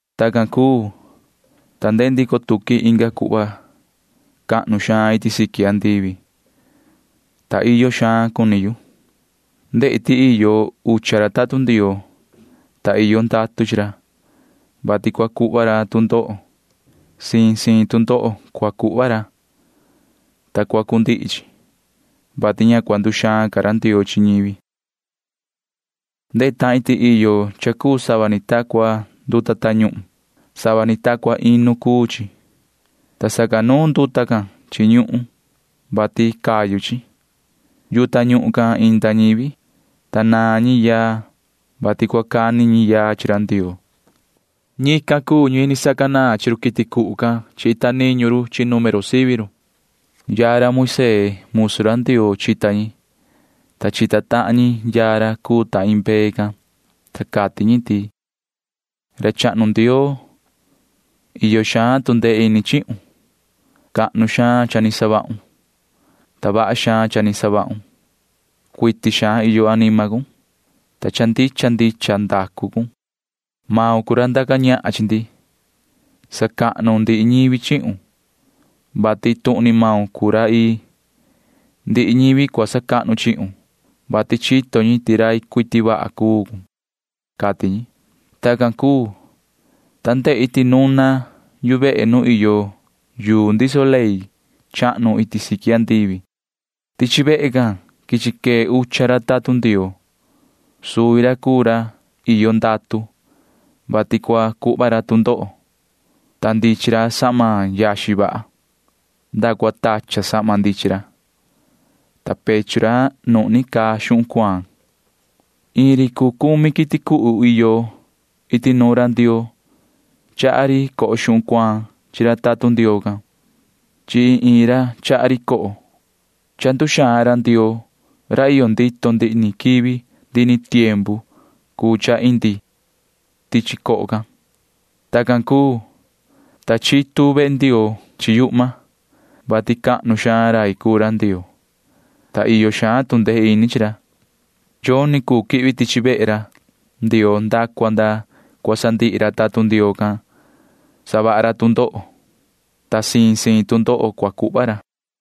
Tacan cuu, ta ndehe ndico tuqui inga cuhva cha cahnu iti siqui andivi, ta iyo xaan cuni yu. Ndehi ti iyo ucha tatun Ndioo, ta iyo ndatu chi ra, vati cua savaha ra tu ndoho. Siin siin tu ndoho cua savaha ra, ta cua cundihi chi, vati ña cua nduxaan ca ra Ndioo chi ñivi. Ndehe tahin ti iyo cha cuu sava ni ta cua nduta tañuhun. Sava ni ta cua inu cuu chi, ta sacanuun nduta can chi ñuhun, vati cayu chi. Yuhu tañuhun can inda ñivi, ta naan ñi yaa, vati cua cani ñi yaa chi ra Ndioo. Ñican cuu ñi sacanaan siqui run quiti cuhu can chi ita niñu ri chi número sivi ri. Yaa ra Moisee musu ra Ndioo chita ñi, ta chita tahan ñi yaa ra cuu ta iin mbee can, ta cati ñi ti: Yoho ra chahnu Ndioo, iyo xaan tu ndee ini chihun. Cahnu xaan cha ni savahun, ta vaha xaan cha ni savahun. Cuiti xaan iyo anima cun, ta cha ndicha ndicha ndacu cun. Maun cuu ra ndaca ñahan chi ndi. Sacahnu ndihi ñivi chihun, vati iin tuhun ni maun cuu ra ii. Ndihi ñivi cua sacahnu chihun, vati chito ñi ti rai cuiti vaha cuu cun, cati ñi. Tacan cuu, ta ndehi ti nuna yu vehe nu iyo yuu ndiso ley chahnu iti siqui andivi. Tichi vehe can quichi quee ucha ra tatun Ndioo. Suvi ra cuu ra iyo ndatu, vati cua savaha ra tu ndoho, ta ndichin ra sahma yaxin vaha. Nda cua tachan sahma ndichin ra, ta pechu ra nuhni caa xuhun cuaan. Iin ri cuu cumi quiti cuhu iyo iti nuun ra Ndioo―chaha ri coho xuhun cuaan chi ra tatun Ndioo can. Chi iin iin ra chaha ri coho. Cha nduxaan ra Ndioo ra iyo ndito ndihi ni quivi ndihi ni tiempu cuu cha indi coho can. Tacan cuu, ta chitu vehe Ndioo can chi yuhma, vati cahnu xaan rai cuu ra Ndioo, ta iyo xaan tu ndee ini chi ra. Yoni cuu quihvi tichi vehe Ndioo nda cua nda cua sandihi ra tatun Ndioo can savaha ra tu ndoho, ta siin siin tu ndoho cua cuhva ra.